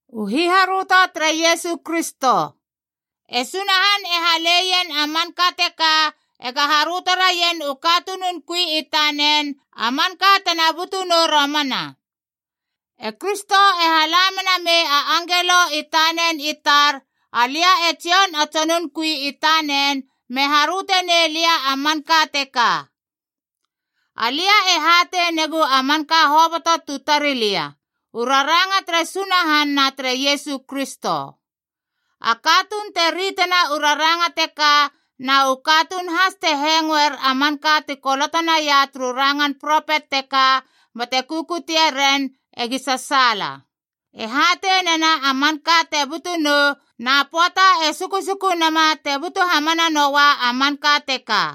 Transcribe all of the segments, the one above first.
U hiharöto tere Iesu Kristo. E Sunahan e haleiena a manka teka ega haröto raien u katunun kui i tanen a manka tena butu nou romana. E Kristo e hala mena mei a angelo i tanen i tar, alia e Jon a tsonun kui i tanen, me haröte nei lia a manka teka. Alia e hatei negu a manka hoboto tu tari lia, u raranga tere Sunahan na tere Iesu Kristo. A katuun te ritena u raranga teka na u katuun has te hengoer a manka ti koloto naia turu rangan propet teka bate kukutie ren, egi sasaala. E hatei nena a manka te butu nou, na pöata e sukusuku nama te butu hamana noua a manka teka.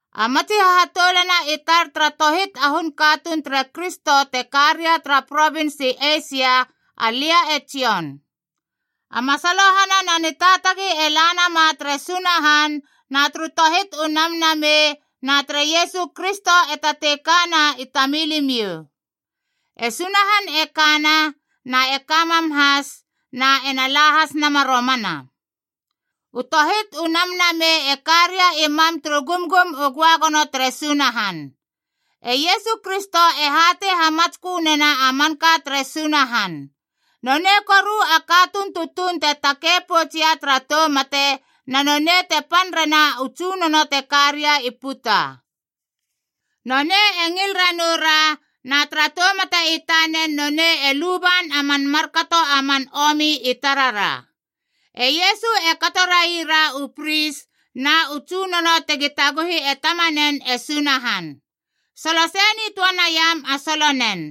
A matsi hahatoulana i tar tara tohit a hun katuun tere Kristo te ka ria tara provins i Eisia, alia e Jon. A masalohana na nitaatagi e la nama tere Sunahan na turu tohit u namnameib na tere Iesu Kristo e tatei kana i tamilimiou. E Sunahan e kana, na e ka mam has, na ena la has nama romana. U tohit u namnamei e ka ria i mam turu gumgum u göagono tere Sunahan. E Iesu Kristo e hatei hamatskö nena a manka tere Sunahan. Nonei koru a katuun tutuun te takei poutsia tara tou mate, na nonei te pan rena u tsunono te ka ria i puta. Nonei e ngil ranoura na tara tou mate i tanen nonei e luban a man markato a man omi i tarara. E Iesu e kato raira u pris na u tsunono tegi taguhi e Tamanen e Sunahan. Solo sei nitöa naiam a solonen.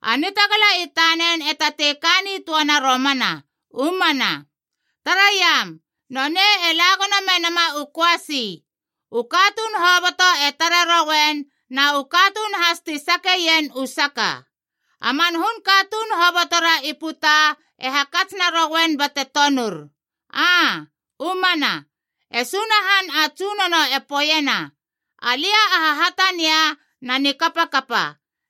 A nitagala i tanen e tatei ka nitöana romana. U mana. Taraiam! Nonei e la gono me nama u köasi. U katuun hoboto e tare rouen, na u katuun has ti sakeien u saka. A man hun katuun hobotora i puta e hakats narouen bate tonur. Aa, u mana. E Sunahan a Tsunono e poeiena, “Alia a Hahatania na Nikapakapa.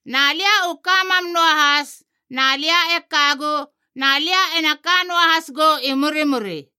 Na lia u ka mam noahas, na lia e kagu, na lia ena ka noahas gou i murimuri.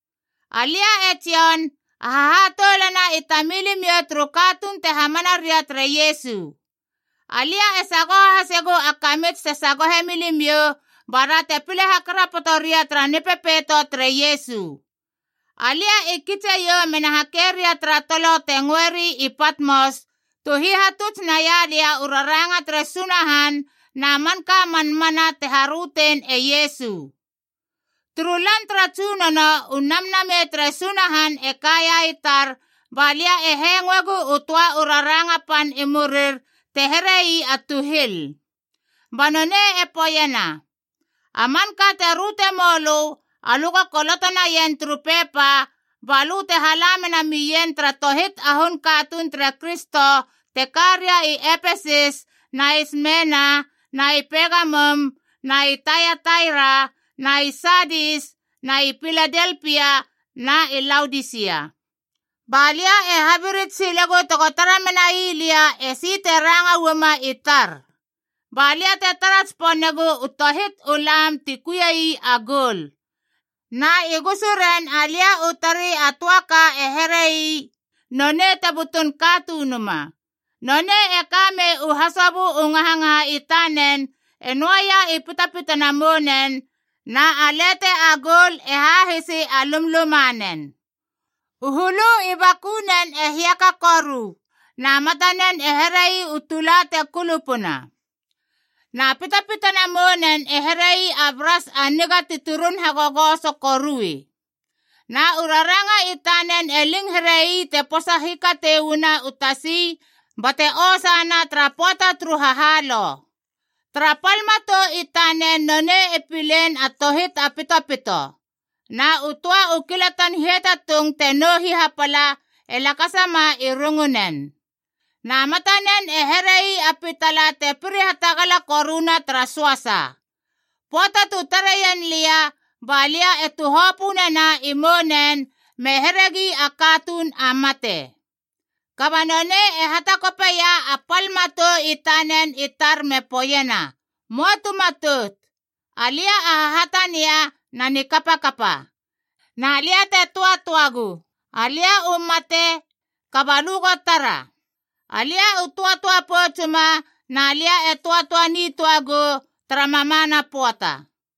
Alia e Jon, a hahatoulana i tamilimiou turu katuun te hamana ria tere Iesu. Alia e sagoho hasegu a kamits te sagohe milimiou, ba ra te pile hakarapoto ria tara Nipepeito tere Iesu. Alia i kitse iou mena hake ria tara tolo te ngöeri i Patmos, tu hihatuts naia lia u raranga tere Sunahan na manka a man mana te harötein e Iesu. Turu lan tara Tsunono, u Namnamei tere Sunahan e kaia i tar ba lia e hengoegu u töa u raranga pan i murir te here ii a tuhil. Ba nonei e poeiena, “A manka te röte mou lö alö go koloto naien turu pepa,d ba lö te hala mena mien tara tohit a hun katuun tere Kristo te ka ria i Epesis na i Smeena na i Pegamum na i Taiataira na i Saadis na i Piladelpia na i Laodisia.” Ba lia e habirits silegu tego tara menai lia esi te ranga uama i tar. Ba lia te tara tsiponegu u tohit u lame ti kuie ii a goul. Na i gusuren alia u tari a töa ka e here ii, nonei te butun Katunuma.f Nonei e kamei u hasobö u ngahangaha i tanen e noaia i pitpitana mounen, na a lete a goul e hahisi a lumlumanen. U hulu i bakunen e hiaka koru. Na matanen e here ii u tula te kulupuna. Na pitapitana mounen e here ii a bras a niga ti turun hagogoso korui. Na u raranga i tanen e ling here ii te posa hikatei uana u tasi bate osana tara pöata turu hahalou. Tara pal matou i tanen nonei e pilein a tohit a pitopito. Na u töa u kilatan hiatatung te nou hihapala e lakasama i rungunen. Na matanen e here ii a pitala te piri hatagala koruna tara söasa. Pöata tu tareien lia, ba lia e tuhopö nena i mounen me heregi a katuun a mate. Kaba nonei e hatakopeia a pal matou i tanen i tar me poeiena, “Möa tu matout. Alia a Hahatania na Nikapakapa. Na lia te töatöagu. Alia u mate, kaba lö go tara! Alia u töatöa poutsuma na lia e töatöa nitöa gou tara mamana pöata.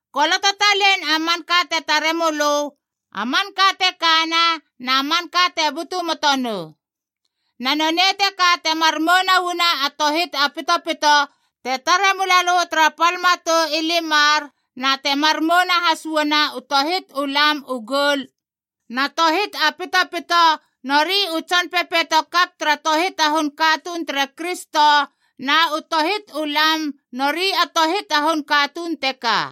Koloto talein a manka te tare mölö, a manka te kana, na manka te butu moto nou. Na nonei teka temar mouna uana a tohit a pitopito te tare mula lö tara pal matou i limar, na temar mouna has uana u tohit u lam u goul: na tohit a pitopito nori u tson pepeito kaph tara tohit a hun katuun tere Kristo, na u tohit u lami nori a tohit a hun katuun teka.”